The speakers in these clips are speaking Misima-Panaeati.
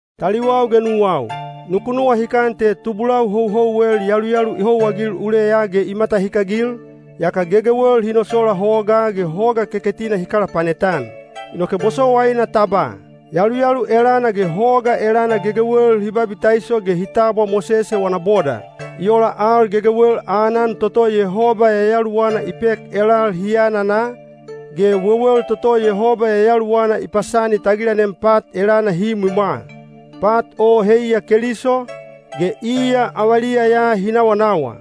Taliwau ge nuwau, nuku nuwahikan te tubulau houhouwel yaluyalu i houwaagil uleya ge i matahikagil, yaka gegewel hi nosola hogaa ge Hoga Keketina hi kalapanet-an. Inoke bosowaina ta ba, yaluyalu elana ge hoga elana gegewel hi babitaiso ge hi tabwa Mosese wana boda. I ola al gegewel aanan toto Yehoba Yayaluwana i pek elal hi anana, ge wewel toto Yehoba Yayaluwana i pasani tagilanem pat elana hi imwimwa. Pat o heiya Keliso, ge iya avaliya ya hi nawanawa.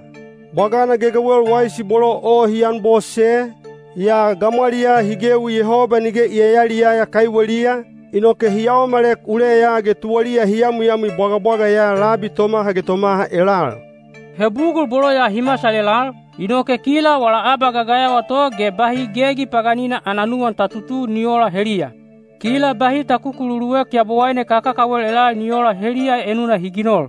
Bwagana gegewel waisi bolo o hi an bose, yaa gamwaliyaa hi gewi Yehoba nige i yayaliyaya kaiweliya, inoke hi yaomalek uleya ge tuwaliya hi yamwiyamwi bwagabwaga ya labi tomaha ge tomaha elal. He bugul bolo ya hi masal elal, inoke kila wala abagagayawa to ge bahi gegi paganina ana nuwan ta tutu ni oola heliya. Kila bahi ta kukululuek yabowaine kakakawel elal ni oola heliya enuna hi ginol.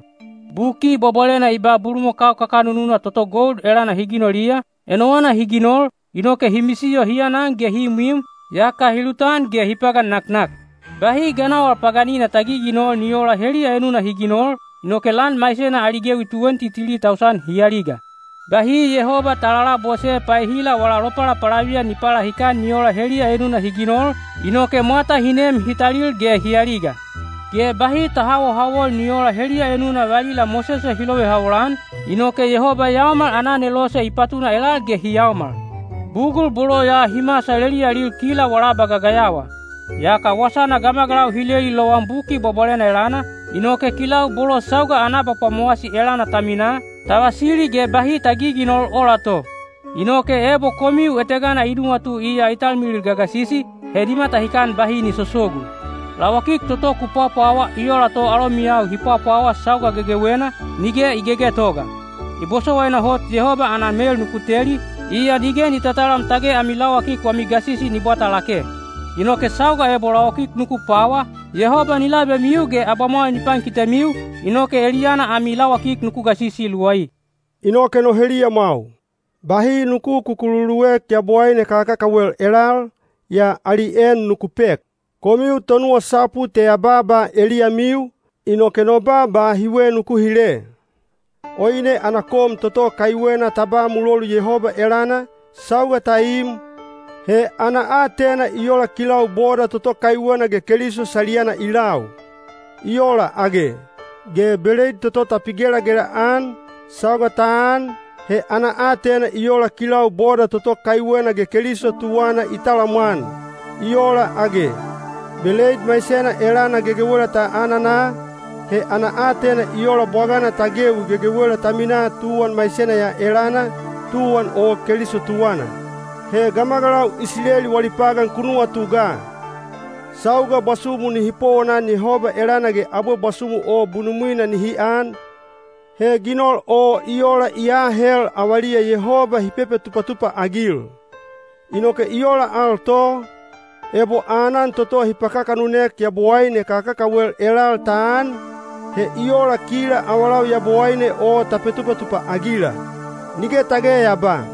Buki Bwabwalena i ba bulumakau kakanununa toto gold elana hi ginoliya, enowana hi ginol, inoke “hi misiyo hi anan ge hi imwim, yaka hi lutan ge hi pagan naknak.” Bahi ganawal paganina ta giginol ni oola heliya enuna hi ginol, inoke lan maisena ali gewi tuwenti tili tausan hi aliga. Bahi Yehoba ta lalabose paehila wala lopalapalaviyan ni palahikan ni oola heliya enuna hi ginol, inoke mwata hi nem hi talil ge hi aliga. Ge bahi ta hawohawol ni oola heliya enuna valila Mosese hi lovehawol-an, inoke Yehoba Yaomal ana Anelose i patuna elal ge hi yaomal. Bugul bolo ya hi masal eliyalil kila wala abagagayawa. Yaka wasana gamagalau hi leli lowan Buki Bwabwalena elana, inoke kilau bolo sauga ana abapwamowasi elana ta minaa, ta vasili ge bahi ta giginol ola to. Inoke ebo komiu etegana i nuwatu iya i talmilil gagasisi, he ni matahikan bahi ni sosogu. Lawakik toto ku pwapwawa i ola to alomiyau hi pwapwawa sauga gegewena, nige i gegetoga. I bosowaina hot Yehoba ana mel nuku teli, iya nige ni tatalam tage ami lawakik wami gasisi ni bwata lake. Inoke sauga ebo lawakik nuku pwawa, Yehoba ni labemiu ge abamwal ni pankitemiu, inoke eliyana ami lawakik nuku gasisi luwai. Inoke no heliyamwau, bahi nuku kukululuek yabowaine kakakawel elal, yaa ali en nuku pek. Komiu tonuwasapu te ya baaba eliyamiu, inoke no baaba hiwe nuku hile. Oine ana kom toto kaiwena ta ba mulolu Yehoba elana, sauga ta im, he ana aatena i ola kilau boda toto kaiwena ge Keliso saliyana i lau. I ola age? Ge beleid toto ta pigelagela-an, sauga ta an, he ana aatena i ola kilau boda toto kaiwena ge Keliso tuwana i talamwan. I ola age? Beleid maisena elana gegewela ta anana, he ana aatena i ola bwagana ta gewi gegewela ta minaa tuwan maisena ya elana, tuwan o Keliso tuwana. He gamagalau Isileli wali pagan ku nuwatu ga. Sauga bwasumu nihi powonan Yehoba elana ge abwe bwasumu o bunumwina nihi an, he ginol o i ola i aahel avaliya Yehoba hi petupatupa-agil. Inoke i ola al to, ebo aanan toto hi pakakanunek yabowaine kakakawel elal ta an, he i ola kila avalau yabowaine o ta petupatupa-agila. Nige tage ya ba,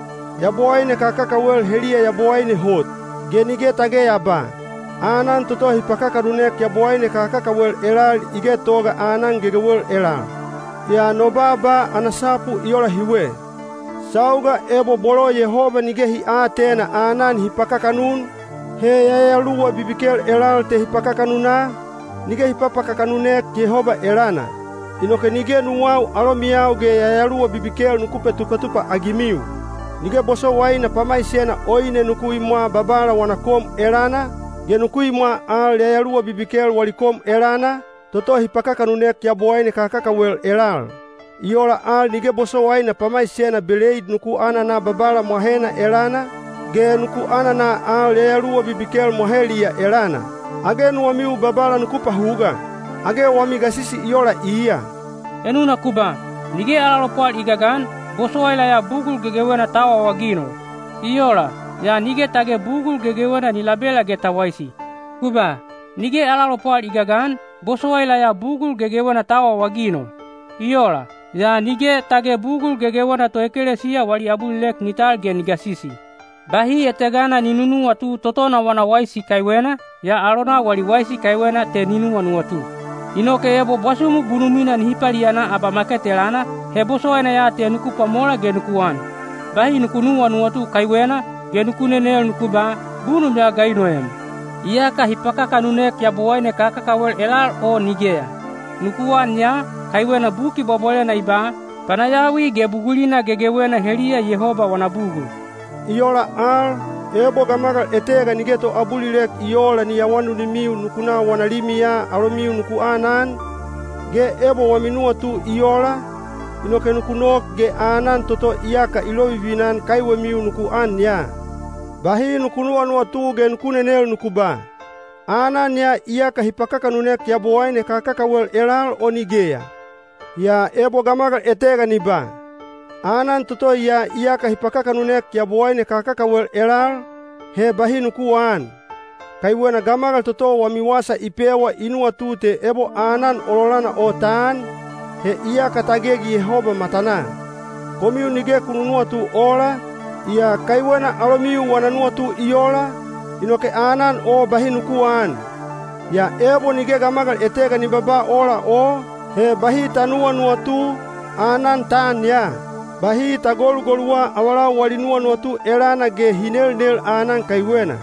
“Yabowaine kakakawel heliya yabowaine hot.” Ge nige tage ya ba, “Aanan toto hi pakakanunek yabowaine kakakawel elal i getoga aanan gegewel elal.” Yaa no baaba ana sapu i ola hiwe: sauga ebo bolo Yehoba nige hi aatena aanan hi pakakanun, he yayaluwa bibikel elal te hi pakakanuna, nige hi papakakanunek Yehoba elana. Inoke nige nuwau alomiyau ge yayaluwa bibikel nuku petupatupa-agimiu. Nige bosowaina pamaisena oine nuku imwa Babala wana kom elana, ge nuku imwa al yayaluwa bibikel wali kom elana, toto hi pakakanunek yabowaine kakakawel elal. I ola al nige bosowaina pamaisena beleid nuku anana Babala mwahena elana, ge nuku anana al yayaluwa bibikel mwaheliya elana. Age nuwamiu Babala nuku pahuga? Age wami gasisi i ola iya? Enuna ku ba, “Nige ala lopwal i gagan, bosowaila ya bugul gegewena ta awaawaginol.” I ola, yaa nige tage bugul gegewena ni labela ge ta waisi. Ku ba, “Nige ala lopwal i gagan, bosowaila ya bugul gegewena ta awaawaginol.” I ola, yaa nige tage bugul gegewena toekelesiya wali abulilek ni tal ge ni gasisi. Bahi etegana ni nunuwatu totona wana waisi kaiwena, yaa alonau wali waisi kaiwena te ni nuwanuwatu. Inoke ebo bwasumu bunumwina nihi paliana abamaket elana, he bosowaina ya te nuku pwamola ge nuku an. Bahi nuku nuwanuwatu kaiwena, ge nuku nenel nuku ba, “Bunum ya ga i noem? Iyaka hi pakakanunek yabowaine kakakawel elal o nigeya?” Nuku an ya, kaiwena Buki Bwabwalena i ba, “Panayawi ge bugulina gegewena heliya Yehoba wana bugul.” I ola al, ebo gamagal etega nige toabulilek i oola ni awanunimiu nuku na wana limiya alomiu nuku anan, ge ebo wami nuwatu i ola, inoke nuku nok ge aanan toto iyaka i lovivina-an kaiwemiu nuku an ya. Bahi nuku nuwanuwatu ge nuku nenel nuku ba, “Aanan ya iyaka hi pakakanunek yabowaine kakakawel elal o nigeya?” Yaa ebo gamagal etega ni ba, “Aanan toto ya iyaka hi pakakanunek yabowaine kakakawel elal,” he bahi nuku aan. Kaiwena gamagal toto wami wasa i pewa i nuwatu te ebo aanan ololana o ta an, he iyaka ta gegi Yehoba matanaa. Komiu nige ku nunuwatu oola, yaa kaiwena alomiu wana nuwatu i ola, inoke aanan o bahi nuku aan. Yaa ebo nige gamagal etega ni babaa ola o, he bahi ta nuwanuwatu, aanan ta an ya. Bahi ta golugoluwa avalau wali nuwanuwatu elana ge hi nelnel aanan kaiwena.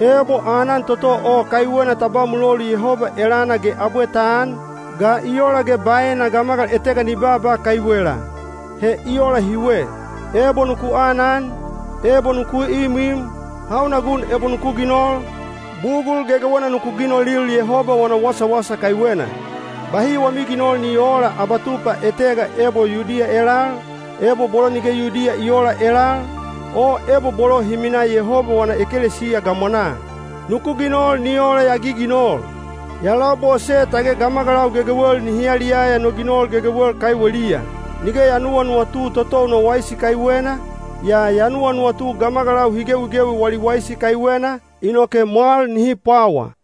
Ebo aanan toto o kaiwena ta ba mulolu Yehoba elana ge abwe ta an, ga i ola ge baena gamagal etega ni baaba kaiwela? He i ola hiwe: ebo nuku anan, ebo nuku imwim, hauna gun ebo nuku ginol, bugul gegewena nuku ginolil Yehoba wana wasawasa kaiwena. Bahi wami ginol ni oola abatupa etega ebo Yudiya elal, ebo bolo nige Yudiya i oola elal, o ebo bolo hi minaa Yehoba wana ekelesiya gamwanaa. Nuku ginol ni ola ya giginol: ya labose tage gamagalau gegewel nihi yaliyaya no ginol gegewel kaiweliya. Nige ya nuwanuwatu totou no waisi kaiwena, yaa ya nuwanuwatu gamagalau hi gewigewi wali waisi kaiwena, inoke mwal nihi pwawa.